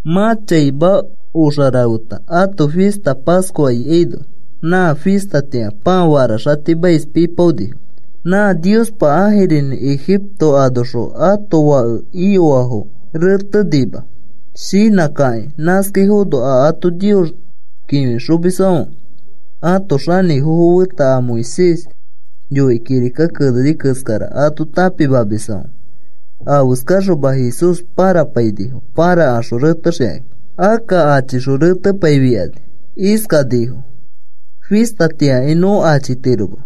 Mã chaima oxa rafeta ãto fista Pascua ikaino, nã fistatĩa pãa faraxatimais pipaonifo, nã Niospa ãjirinĩ Ejipto anoxõ ãto fake iyoafo rẽtenima shinãkakĩ. Nãskaifono a ato Nios kĩfixomisfãfe ãto xanĩfofo feta a Moisés yoikĩ kirika keneni keskara ato tãpimamisfãfe, afeskaxoma Jesús pãrapainifo pãrakaxõ retexikakĩ. Akka achixõ retepaifikani, iskanifo: “Fistatĩakai nõ achitiroma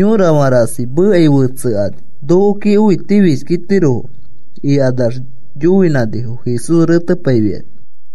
yorafã rasi mekai fetsekani nokoki õitifishkitirofo,” ikanax yoinãnifo Jesús retepaifikani.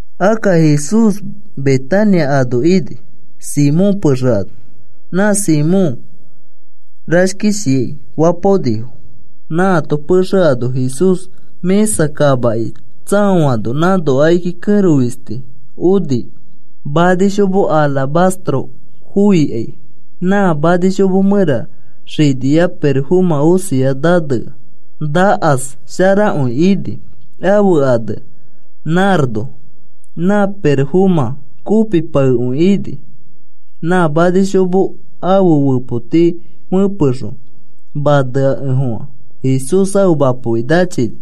Akka Jesús Betania ano ini, Simón pexe ano. Nã Simón “Rashkishiai” fapaonifo. Nãato pexe ano Jesús mĩsa kamaki tsaoano, nãno akiki kẽro fisti oni manishomo “alabastro” foikai. Na manishomo mẽra xinia pirofomã osia nanea nakas sharakõi ini, ãfe ane “nardo.” Nã pirofomã kopipaekõi ini, na manishomo ãfe fepoti fepexõ maneakefofã Jesús ãfe mapoki nachini,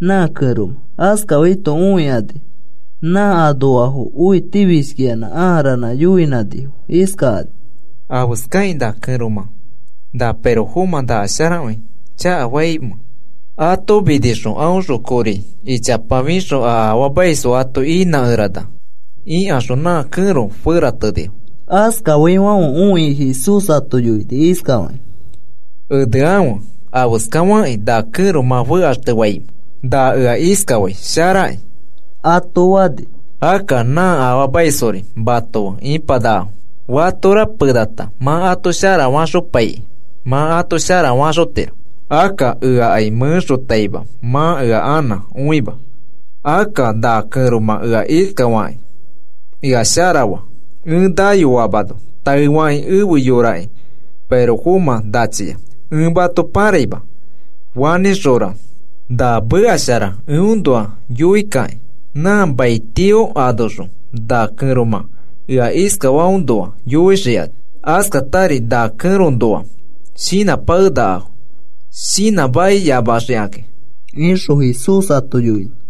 nã kẽromã. Askafaito õikani nã anoafo õitifishkiyanã ãa ranã yoinãnifo iskakani: “¿Afeskakĩ na kẽromã na pirofomã sharakõi chakanafaimẽ? Ato minixõ, aõxõ kori ichapa fixõ a afaamaisfo ato inãkerana,” ikaxõ nã kẽro feratenifo. Askafaifãfe õikĩ Jesús ato yoini iskafakĩ: “Enekãfe. ¿Afeskafakĩ na kẽro mã fekaxtefaimẽ? Na ea iskafai sharakĩ,” ato fani. “Akka nã afaamaisfori mato fe ipanakafo, fatora penata mã ato sharafaxopaikĩ mã ato sharafaxotiro. Akka eakai mẽxotaima mã ea anã õima. Akka na kẽromã ea iskafakĩ ea sharafa. Ẽ nayoamano taefakĩ ẽfe yoraki pirofomã nachia. Ẽ mato pãraima, fanĩxõra na meka shara eõnoa yoikakĩ nã mai tio anoxõ na kẽromã ea iskafaõnoa yoixikani. Askatari na kẽroõnoa shinãpakenakafo, shinãmakiyamaxikakĩ,” ixõ Jesús ato yoini.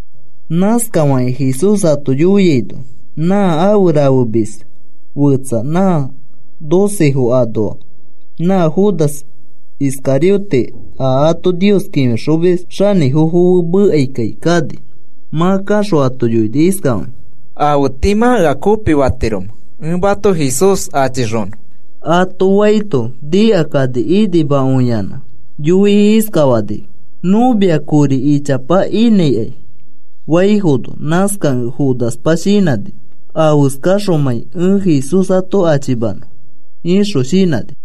Nãskafakĩ Jesús ato yoiaino nã afe rafemis fetsa nã docefo anoa, nã Judas Iscariote a ato Nios kĩfixomis xanĩfofo fe mekaikai kani. Mã kaxõ ato yoini iskafakĩ: “¿Afe tii mã ea kopifatiromẽ ẽ mato Jesús achixonõ?” ato faito, nikakani inimakõiyanã yoikĩ iskafanifo: “Nõ mia kori ichapa inãikai,” faifono, nãskakẽ Judaspa shinãni: “Afeskaxomãi ẽ Jesús ato achimanõ,” ixõ shinãni.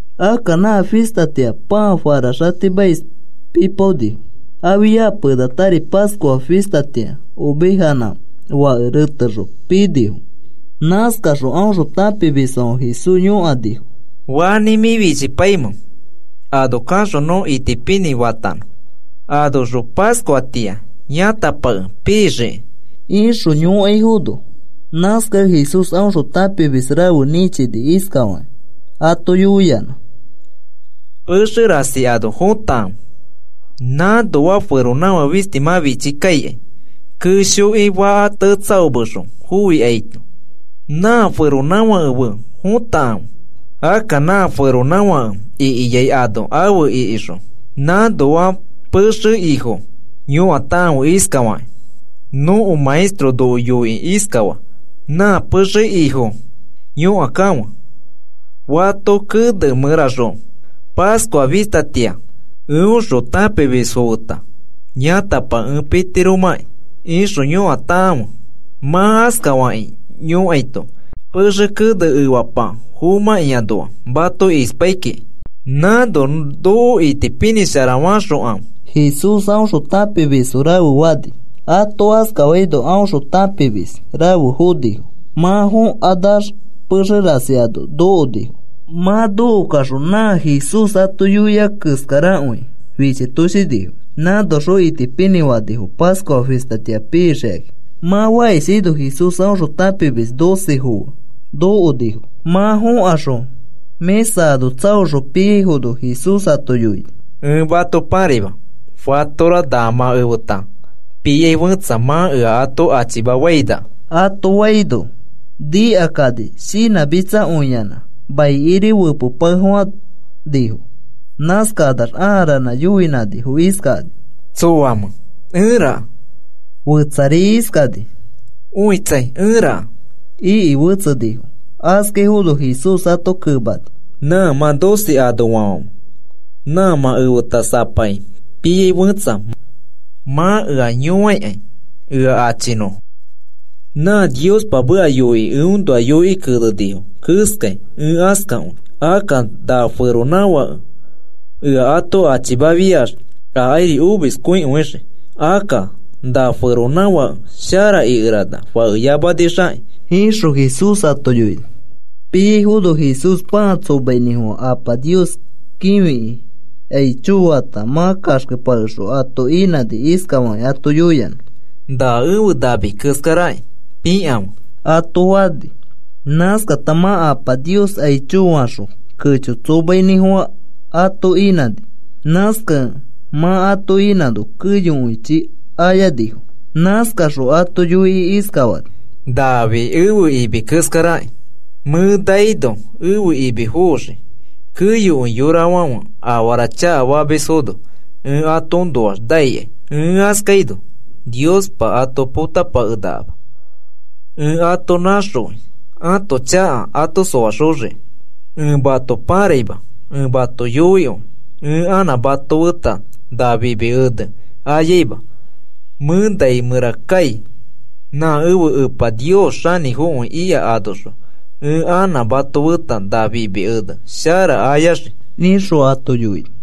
Akka nã fistatĩa pãa faraxatimais pipaonifo. Afia penatari Pascua fistatĩa ovejanã fake retexõ pinifo. Nãskano aõxõ tãpimisfãfe Jesús yõkanifo. “¿Fanĩ mĩ fichipaimẽ ano kaxõ nõ itipinĩ fanõ, anoxõ Pascuatĩa yãtapake pixiki?” ixõ yõkaifono, nãskakẽ Jesús aõxõ tãpimis rafe nĩchini, iskafakĩ ato yoiyanã: “Pexe rasi ano fotakãfe. Nãnoa feronãfake fisti mã fichikaikai keshoki faka tetsaomexõ foikaino, nã feronãfake fe fõtakãfe. Akka nã feronãfake ikiai ano afe ikixõ, nãnoa pexe ifo yõkakãfe iskafakĩ: ‘Nõko Maestro noko yoikĩ iskafaa: “Nã pexe ifo yõkakãfe, ¿Fato kene mẽraxõ Pascua fistatĩa eõxõ tãpimisfo feta yãtapake ẽ pitiromãkĩ?” ixõ yõkakãfe.’ Mã askafakĩ yõkaito pexe kene efapa fomãkĩanoa mato ispai kiki mã itipinĩkõia. Nãno noko itipinĩsharafaxokãfe,” Jesús aõxõ tãpimisfo rafe fani. Ato askafaino aõxõ tãpimis rafe fonifo. Mã fokanax pexe rasi ano nokonifo. Mã nokokaxõ nã Jesús ato yoia keskarakõi fichitoshinifo. Nãnoxõ itipinĩ fanifo Pascua fistatĩa pixikakĩ. Mã fakishaino Jesús aõxõ tãpimis docefo fe nokonifo. Mã fokaxõ mĩsa ano tsaoxõ piaifono Jesús ato yoini. “Ẽ mato pãraima fatora na mã efeta piai fẽtsa mã ea ato achimafainaka,” ato faino, nikakani shinãmitsakõiyanã maikiri fepepakefofãnifo. Nãskakanax ãa ranã yoinãnifo iskakani: “¿Tsoamẽ, ẽraka?” Fetsari iskani: “Õitsai, ẽraka,” iki fetsenifo. Askaifono Jesús ato kemani: “Nã mã docefo anoafãfe, nã mã efeta sapaki piai fẽtsa mã ea yõaikai ea achinõfo. Nã Niospa meka yoiki, eõnoa yoikĩ kenenifo keskai ẽ askakõi. Akka na feronãfãke ea ato achimafiax akairi omiskõikõixii. Akka na feronãfake shara ikerana fakeyamanixakĩ,” ixõ Jesús ato yoini. Piaifono Jesús pãa tsomainĩfofã. Apa Nios kĩfiki aicho fata, mã kaxkepakexõ ato inãni, iskafakĩ ato yoiyanã: “Na ẽfe nami keskaraki pĩkãfe,” ato fani. Nãskata mã Apa Nios aicho faxõ, kecho tsomainĩfofã ato inãni. Nãskakẽ mã ato inãno keyokõichi ayanifo. Nãskaxõ ato yoikĩ iskafani: “Nafi ẽfe imi keskaraki. Mẽ naino ẽfe imi foxii. Keyokõi yorafãfe afara chakafamisfono ẽ atoõnoax naikai. Ẽ askaino Niospa ato potapakenakama. Ẽ ato naxõi ãto chaka ato soaxoxiki. Ẽ mato pãraima. Ẽ mato yoikõi ẽ anã mato feta na fimi ene ayaima. Mẽ nai mẽra kai. Nã ẽfe Epa Nios xanĩfokõi ika anoxõ ẽ anã mato feta na fimi ene shara ayaxii,” ixõ ato yoini.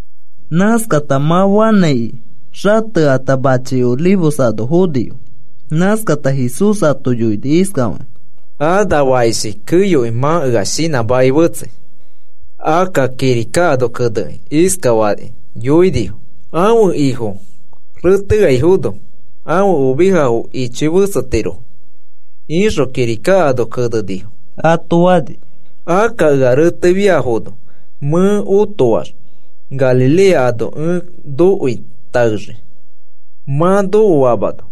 Nãskata mã fanãiki xatekata machi Olivos ano fonifo. Nãskata Jesús ato yoini iskafakĩ: “A na fakishi keyokõi mã ea shinãmakĩ fetsei. Akka kirika ano kenekĩ iskafakĩ yoinifo: ‘Ãfe ifo reteaifono, ãfe ovejafo ichoi fetsetirofo,’ ixõ kirika ano kenenifo,” ato fani. “Akka ea retefiafono mẽ otoax Galilea ano ẽ nokoi taexii mã nokoamano,”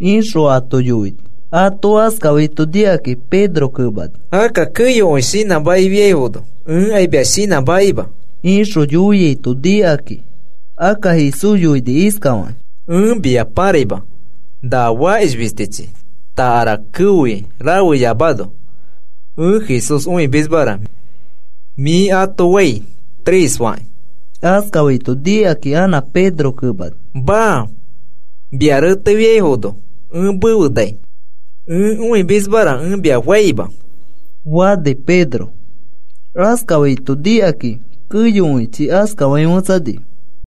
ixõ ato yoini. Ato askafaito nikakĩ Pedro kemani. “Akka keyokõi shinãmakifiaifono ẽkai mia shinãmakima,” ixõ yoiaito, nikakĩ akka Jesús yoini iskafaki: “Ẽ mia pãraima na fakish fistichi takara keoi rafeyamano, ‘Ẽ Jesús õimismara,’ mĩ ato fai tres fakĩ.” Askafaito nikakĩ anã Pedro kemani. “Maa. Mia retefiaifono ẽ mefe nai. Ẽ õimismara ẽ mia faima,” fani. Pedro askafaito nikakakĩ keyokõichi askafakĩ fetsanifo.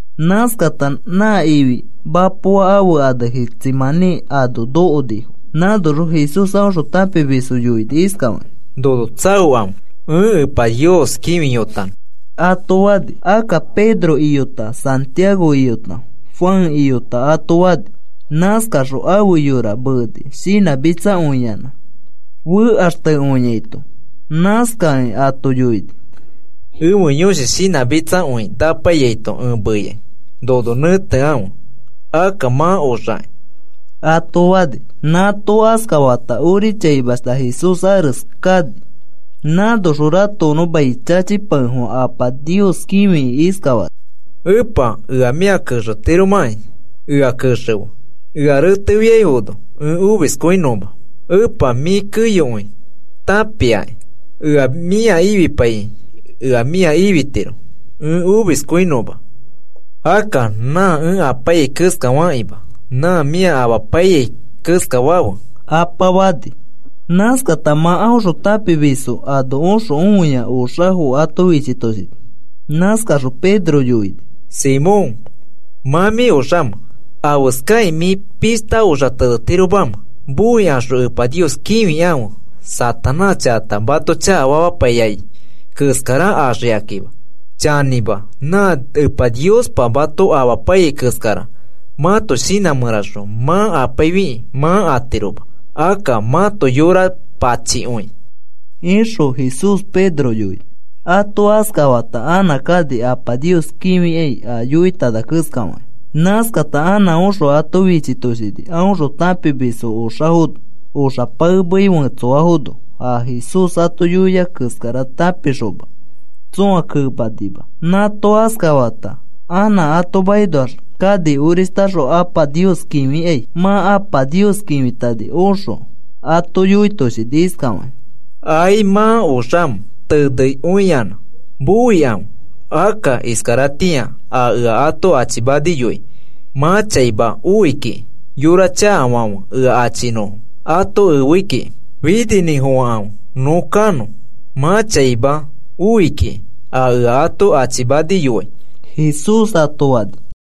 Nãskakata nã ifi mapoa ãfe ane Getsemaní ano nokonifo. Nãnoxõ Jesús aõxõ tãpimisfo yoini iskafakĩ: “Nono tsaokãfe. Ẽ Epa Nios kĩfiyotanõ,” ato fani. Akka Pedro iyota, Santiago iyota, Juan iyota ato fani. Nãskaxõ ãfe yora meeni shinãmitsakõiyanã fekaxtekõiaito, nãskakĩ ato yoini: “Ẽfe yõshi shinãmitsakõi napaiyaito ẽ meikai. Nono nẽtekãfe, akka mã oxaki,” ato fani. Nãato askafata ori chaimashta Jesús ares kani. Nãnoxõ ratokonõ mai chachipakefofã Apa Nios kĩfikĩ iskafani: “Epa, ea mĩa kexetiromakĩ ea kexefe ea reteaifono ẽ omiskõinõma. Epa, mĩ keyokõi tãpiakĩ. Ea mĩa ifipaikĩ ea mĩa ifitiro ẽ omiskõinõma. Akka nã ẽ apaiyai keskafakĩma nã mĩ ea amapaiyai keskafafe,” Apa fani. Nãskata mã aõxõ tãpimisfo ano oxõ õia oxafo ato fichitoshini. Nãskaxõ Pedro yoini: “Simón, ¿mã mĩ oxamẽ? ¿Afeskakĩ mĩ pishta oxa tenetiromamẽ? Moikaxõ Epa Nios kĩfikãfe Satanás chakata mato chakafamapaiyai keskara axikakima. Chanĩma, nã Epa Niospa mato amapaiyai keskara mãto shinã mẽraxõ mã apaifikĩ mã atiroma. Akka mãto yora pachikõikĩ,” ixõ Jesús Pedro yoini. Ato askafata anã kani Apa Nios kĩfikai a yoitana keskafakĩ. Nãskata anã oxõ ato fichitoshini aõxõ tãpimisfo oxafono, oxa paemei fetsoafono, a Jesús ato yoiai keskara tãpikaxoma tsõa kemanima. Nãato askafata anã ato makinoax kani orishtaxõ Apa Nios kĩfikai. Mã Apa Nios kĩfitani oxõ ato yoitoshini iskafakĩ: “¿Ai mã oxamẽ tenekõiyanã? Moikãfe. Akka iskaratĩa a ea ato achimaniyoai mã chaima oi kiki. Yora chakafãfe ea achifenõfo ato efe ikiki. Fininĩfofãkãfe nõ kanõ. Mã chaima oi kiki a ea ato achimaniyoai,” Jesús ato fani.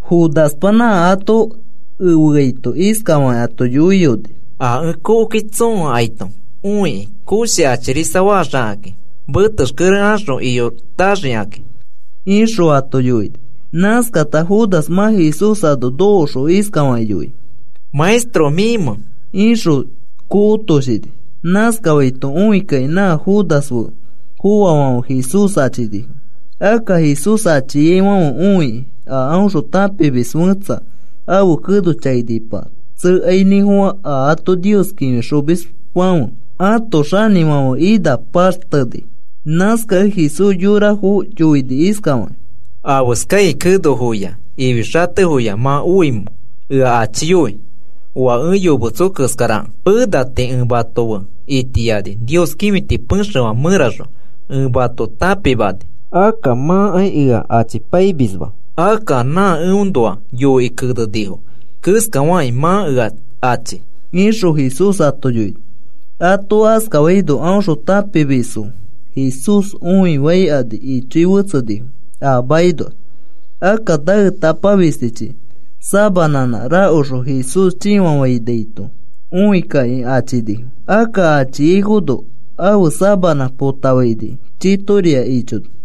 Judaspa nã ato efeaito iskafakĩ ato yoiyoni: “A ẽ kokoki tsoo akaito õikĩ koshi achirisafaxikãki metexkere axõ iyotaxikãki,” ixõ ato yoini. Nãskata Judas mã Jesús ano nokoxõ iskafakĩ yoini: “¿Maestro, mĩmẽ?” ixõ kokotoshini. Nãskafaito õikakĩ nã Judas fe foafãfe Jesús achinifo. Akka Jesús achiaifãfe õikĩ a aõxõ tãpimis fẽtsa ãfe keno chainipa tsekainĩfofã, a ato Nios kĩfixomisfãfe ãto xanĩfãfe ina paxteni. Nãskakẽ Jesús yorafo yoini iskafakĩ: “¿Afeskai kenofoya ifi xatefoya mã oamẽ ea achiyoi oa ẽ yometso keskarakẽ? Pena tii ẽ mato fe itiani Nios kĩfiti pexefã mẽraxõ ẽ mato tãpimani, akka mãkai ea achipaimisma. Akka nã eõnoa yoikĩ kenenifo keskafakĩ mã ea achi,” ixõ Jesús ato yoini. Ato askafaino aõxõ tãpimisfo Jesús õifaikani. Ichoi fetsenifo a makinoax. Akka naetapa fistichi sabanãnã rakoxõ Jesús chĩfafainaito õikakĩ achinifo. Akka achiaifono ãfe sabanã potafaini chitoria ichoni.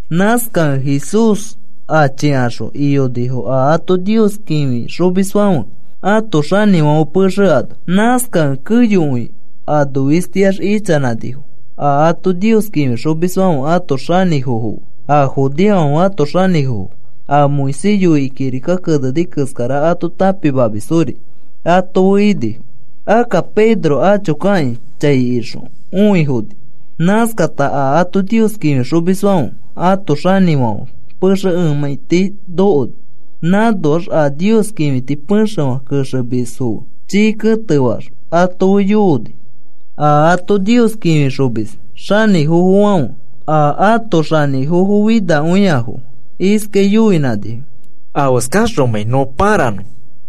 Nãskakẽ Jesús achikaxõ iyonifo a ato Nios kĩfixomisfãfe ãto xanĩfãfe pexe ano. Nãskakẽ keyokõi anofistiax ichanãnifo a ato Nios kĩfixomisfãfe ãto xanĩfofo fe a judeofãfe ãto xanĩfofo a Moisés yoikĩ kirika keneni keskara ato tãpimamisfori ato fe inifo. Akka Pedro acho kakĩ chai ixõ õifoni. Nãskata a ato Nios kĩfixomisfãfe ãto xanĩfãfe pexe emãiti nokoni. Nãnoax a Nios kĩfiti pexefã kexemisfo fe chii ketefax ato fe yooni. A ato Nios kĩfixomis xanĩfofofãfe a ãto xanĩfofinakõiafo fe iskai yoinãnifo: “Afeskaxomãi nõ pãranõ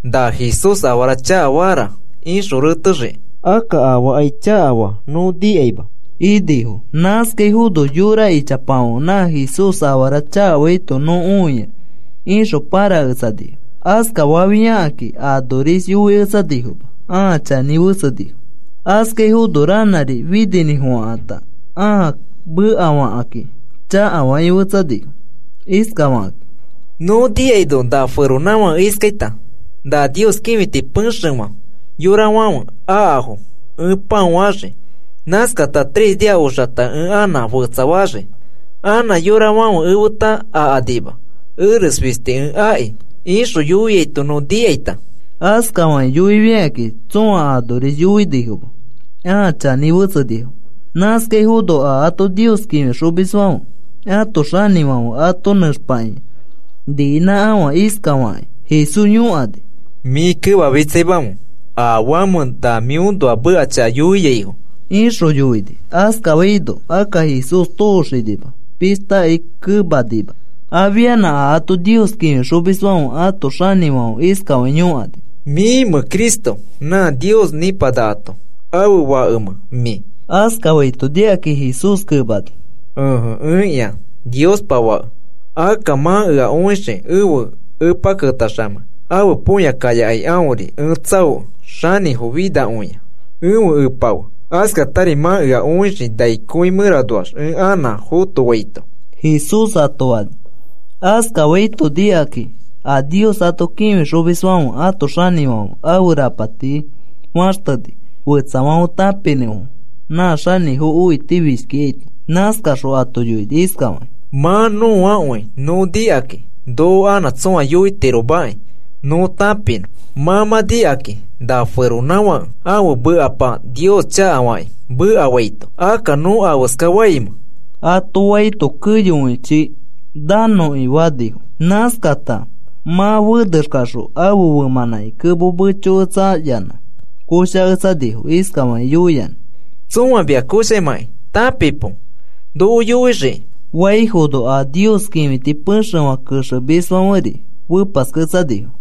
na Jesús afara chakafara ixõ retexiki. Akka afaakai chakafa nõ nikaima,” inifo. Nãskaifono yora ichapafãfe, “Na Jesús afara chakafaito nõ õia,” ixõ pãraketsanifo. Askafafiakakĩ anoris yoiketsanifoma. Ãa chanĩ fetsenifo. Askafaifono ranãri fininĩfofãkãta ãa mekafakakĩ chakafakĩ fetsanifo iskafakakĩ: “Nõ nikaino na feronãfake iskaita: ‘Na Nios kĩfiti pexefã yorafãfe akafo ẽ pãofaxii. Nãskata tres nia oxata ẽ anã fetsafaxii, anã yorafãfe efeta akanima, eres fisti ẽ aki,’ ixõ yoiaito nõ nikaita.” Askafakĩ yoifikakĩ tsõa anoris yoinifoma, ãa chanĩ fetsenifo. Nãskafaifono a ato Nios kĩfixomisfãfe ãto xanĩfãfe ato nẽxpakĩa niinãkafã iskafakĩ Jesús yõkani: “¿Mĩ kemamitsaimamẽ afamẽ na mĩõnoa meka chaka yoiaifo?” ixõ yoini. Askafaino akka Jesús tooxinima, pishtakai kemanima. Afianã a ato Nios kĩfixomisfãfe ãto xanĩfãfe iskafakĩ yõkani: “¿Mĩmẽ Cristo? ¿Nã Nios nipanakato ãfe Fakemẽ, mĩ?” Askafaito nikakĩ Jesús kemani: “Ẽje, ẽkĩa Niospa Fake. Akka mã ea õixii ẽfe Epa ketaxamei ãfe põya kayakai aõri ẽ tsãokẽ xanĩfo finakõia ẽfe Epa fe. Askatari mã ea õixii nai kõi mẽranoax ẽ anã fotofaito,” Jesús ato fani. Askafaito nikakĩ a Nios ato kĩfixomisfãfe ãto xanĩfãfe ãfe rapati faxteni fetsafãfe tãpinõfo nã xanĩfo õitifishkikaito. Nãskaxõ ato yoini iskafakĩ: “Mã nõakõi nõ nikakĩ noko anã tsõa yoitiromaki nõ tãpinõ. Mã mã nikakĩ na feronãfake ãfe mekapa Nios chakafakĩ mekafaito. Akka, ¿nõ afeskafaimẽ?” ato faito keyokõichi, “Nanõki,” fanifo. Nãskakata mã fenexkaxõ ãfe femãnãki kemo mechoketsayanã koshaketsanifo iskafakĩ yoiyanã: “Tsõa mia koshamakĩ tãpipo noko yoixiki,” faifono, a Nios kĩfiti pexefã kexemisfãferi fepasketsanifo.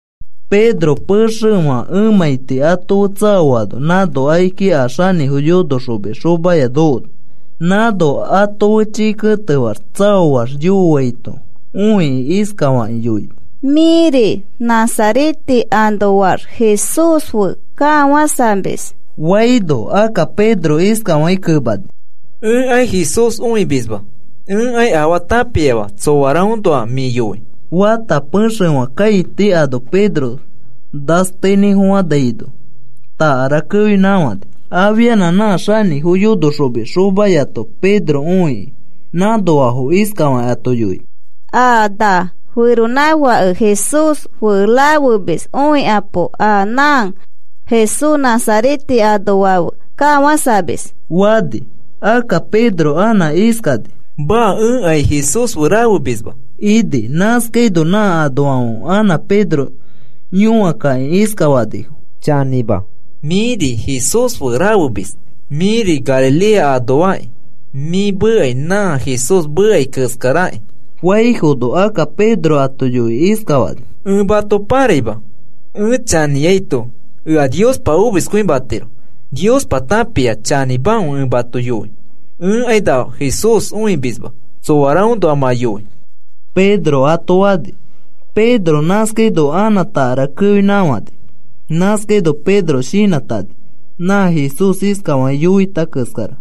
Pedro pexefã emãiti ato fe tsaoano, nãno akiki a xanĩfo yonoxomis xomaya nokoni. Nãno ato fe chii ketefaax tsaoax yooaito õikĩ, iskafakĩ yoini: “Mĩri Nazarete anoax Jesús fe kafãsamis,” faino, akka Pedro iskafakĩ kemani: “Ẽkai Jesús õimisma. Ẽkai afaa tãpiama tsoaraõnoa mĩ yoi,” fata, pexefã kãiti ano Pedro nasteinĩfofãnaino, takara keonãkafãni. Afianã nã xanĩfo yonoxomis xomayato Pedro õiki, nãnoafo iskafakĩ ato yoini: “A na feronãfake Jesús fe rafemis õikapo, a nã Jesús Nazarete anoa fe kafãsamis,” fani. Akka Pedro anã iskani: “Maa, ẽkai Jesús fe rafemisma,” ini. Nãskaino nã anoafãfe anã Pedro yõakakĩ iskafanifo: “Chanĩma, mĩri Jesús fe rafemis. Mĩri Galilea anoakĩ mĩ mekai nã Jesús mekai keskarakĩ,” faifono, akka Pedro ato yoikĩ iskafani: “Ẽ mato pãraima, ẽ chanĩaito ea Niospa omiskõimatiro. Niospa tãpia chanĩmakõi ẽ mato yoi. Ẽkai na Jesús õimisma tsoaraõnoa mã yoi,” Pedro ato fani. Pedro nãskaino anã takara keoinãkafãni. Nãskaino Pedro shinãtani nã Jesús iskafakĩ yoita keskara: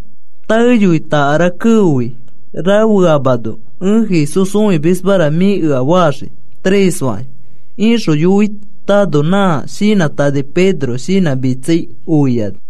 “Taeyoi takara keofi rafeamano, ‘Ẽ Jesús õimismara,’ mĩ ea faxii tres fakĩ,” ixõ yoitano, nã shinãtani Pedro shinãmitsai oiakõini.